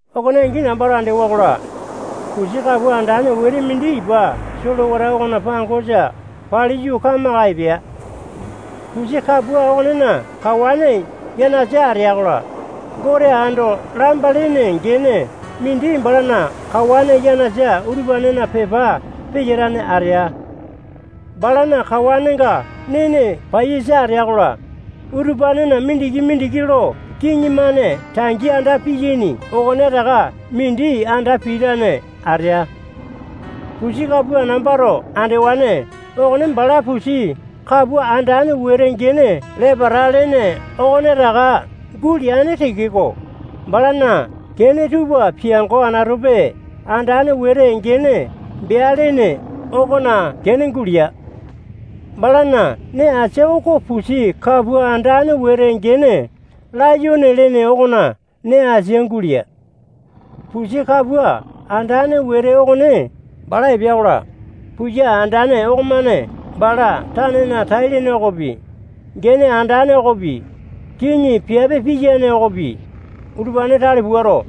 Okone angi nambato andewa-kola, pusi kapua andane wete mindi ipa solewata okona pangosa paliyu, kamaka epea. Pusi kapua okonena kawane yanasa atea-kola, Gote ando lamba lene gene mindi balana kawane yanasa utupanena pepa peyatane atea. Balana kawanenga nene paiyasa atea-kola, utupanena mindiki-mindiki lo kiŋi-mane tangi anda piyaini okonetaka mindi anda pitane atea. Pusi kapua nambato andewane okone bala pusi kapua andane wete gene lepata lene okonetaka guleane tekeko, balana kene tupa piango anatope andane wete gene bea lene okona kene gulea. Balana nee asia oko pusi kapua andane wete gene layone lene okona nee asia gulea. Pusi kapua andane wete okone bala epea-kola, puya andane okomane bala tanena tai-lene okopi, gene andane okopi, kiŋi piape piyane okopi, utupane tale puato,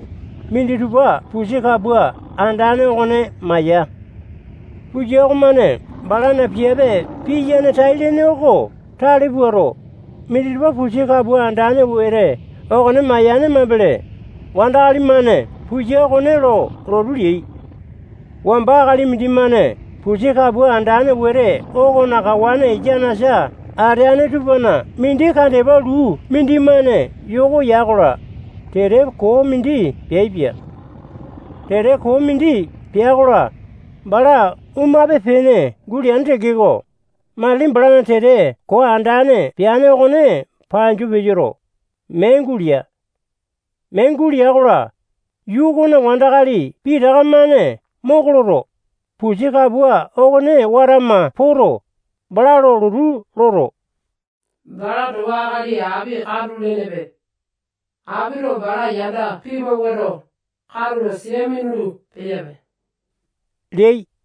minditupa pusi kapua andane okone maya. Puya okomane balana piape piyane tai-lene oko tale puato, minditupa pusi kapua andane wete okone mayane mambele, wandakali-mane puya okone lo lotu leai. Wamba akali mindimane pusi kapua andane wete okona kawane yanasa ateane tupana mindi kandepa luu mindimane yoko ya-kola, tete koo mindi peaipia. Tete koo mindi pea-kola, bala omape-pene guleane tekeko, matili balana tete koo andane peane okone panju peyoto, mee gulea. Mee gulea-kola, yuu okona wandakali pitaka-mane moko loto, pusi kapua okone watama poto, bala lo lotu loto, bala towa akali api katu lenepe. Apito bala yanda pimawuato, katulo sia minulu-peyape leai.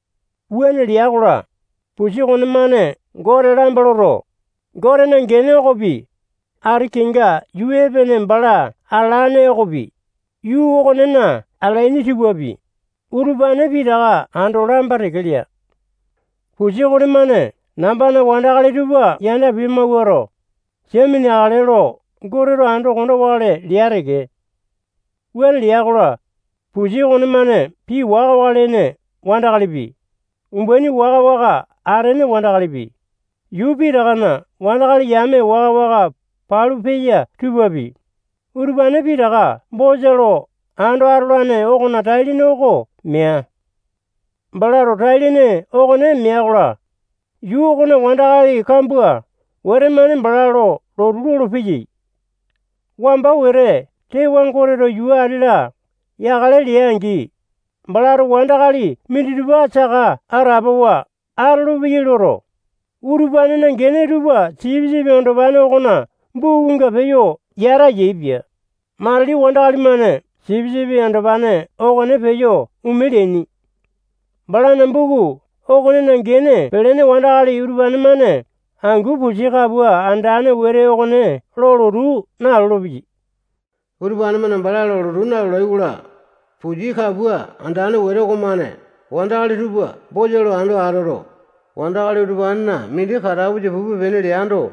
Wuane lea-kola, pusi okonemane Gote lamba loto, Gotena gene okopi, ati kenga yuu epene bala atalane okopi, yuu okonena atalaini tupapi, utupane pitaka ando lamba teke lea. Pusi okonemane nambana wandakali tupa yanda pimawuato, sia mineakale lo Goteto ando konda wakale lea teke. Wuane lea-kola, pusi okonemane pii waka-waka lene wandakalipi, umbaini waka-waka atene wandakalipi, yuu pitakana wandakali yame waka-waka palu peya tupapi, utupane pitaka bosa lo ando atolane okona tai-lene oko mea. Balato tai-lene okone mea-kola, yuu okona wandakali kambua wete-mane bala lo lotu lolopeyai. Wamba wete tewa Goteto yuu ati-la yakale lea-angi, balato wandakali minditupa saka atapowa atolopeyai loto, utupanena gene tupa Sipisipi Andopane okona bukunga peyo yata yaepia. Matili wandakali-mane Sipisipi Andopane okone peyo ome leaini. Balana buku okonena gene pelene wandakali utupane-mane angu pusi kapua andane wete okone lo lotu nalolo-peyai. Utupane-mane bala lo lotu nalolai-kola, pusi kapua andane wete okomane wandakali tupa bosa lo ando atoto, wandakali utupanena mindi katapusa pupe-pene leando,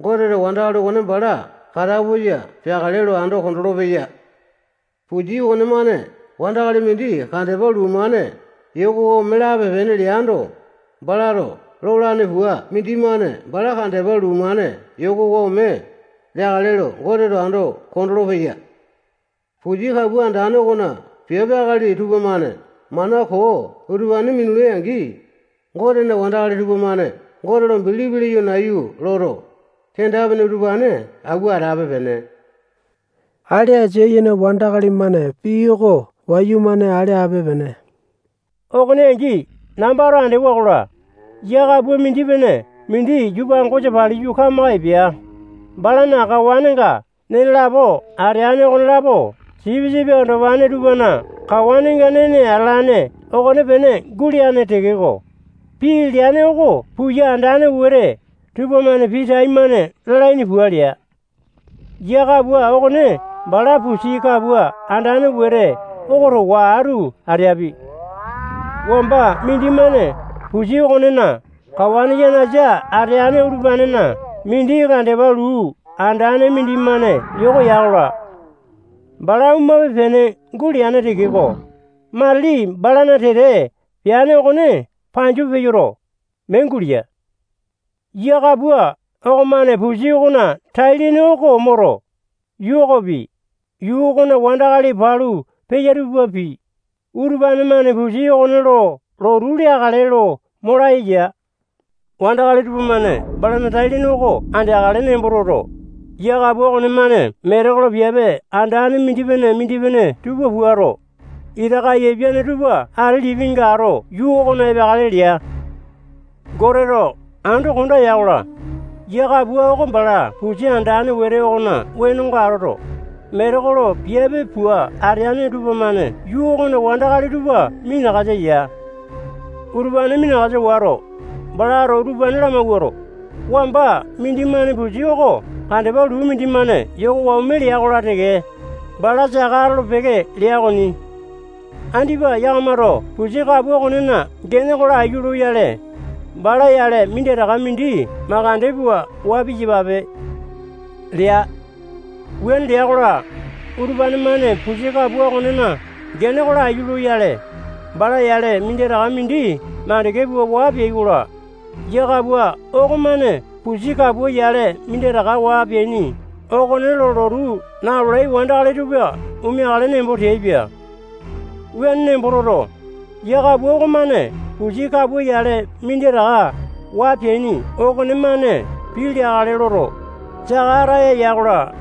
Goteto wandakali okone bala katapusa peakale lo ando kondolo-peya. Pusi okonemane wandakali mindi kandepa luu-mane yokowa ome lape-pene leando, balato lolane pua mindimane bala kandepa luu-mane yokowa ome leakale lo Goteto ando kondolo-peya. Pusi kapua andane okona piape akali tupamane mana koo utupane minulai-angi, Gotena wandakali tupamane Gote lo bilipi leyo nayu loto, kenda-pene utupane auwa atape-pene. Ale asia yene wandakali-mane pii oko wayumane ale ape-pene. Okone angi nambato andewa-kola, yia kapua mindi-pene mindi yuu pangosa paliyu kamaka epea. Balana kawanenga nene lapo ateane okonelapo sipisipi andopane tupana kawanenga nene atalane okonepene guleane tekeko, pii leane oko puya andane wete tupamane pii taimane lalaini pua lea. Yia kapua okone bala pusi kapua andane wete oko towa atu ateapi. Wamba mindimane pusi okonena kawane yanasa ateane utupanena mindi kandepa luu andane mindimane yoko ya-kola, bala omape-pene guleane tekeko, matili balana tete peane okone panju peyoto, mee gulea. Yia kapua okomane pusi okona tai-lene oko moto, yuu okopi, yuu okona wandakali palu peya tupapi, utupane-mane pusi okone lo lotu leakale lo mo laya ya. Wandakali tupamane balana tai-lene oko andeakale nembo toto, yia kapua okonemane metekolo piape andane mindipene-mindipene tupa puato, ita kaiyapiane tupa ati lipinga ato yuu okona epeakale lea. Goteto ando konda ya-kola, yia kapua oko bala pusi andane wete okona wenonga atoto, metekolo piape pua ateane tupamane yuu okona wandakali tupa minakasa ya. Utupane minakasa wato, balato utupane lamawuato, wamba mindimane pusi oko kandepa luu mindimane yokowa ome lea-kola teke, bala saka atolo-peke lea okoni. Andipa yakamato pusi kapua okonena gene oko laiyu loyale, bala yale minditaka mindi makande pua waa piyapape lea. Wuane lea-kola, utupane-mane pusi kapua okonena gene oko laiyu loyale, bala yale minditaka mindi makande pua waa peai-kola, yia kapua okomane pusi kapua yale minditaka waa peaini okone lo lotu nalolai wandakali tupa omeakale nembo teaipia. Wuane nembo toto, yia kapua okomane pusi kapua yale minditaka waa peaini okonemane pii leakale loto, saka ataya ya-kola,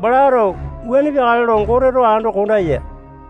balato wuane peakale lo Goteto ando konda ya.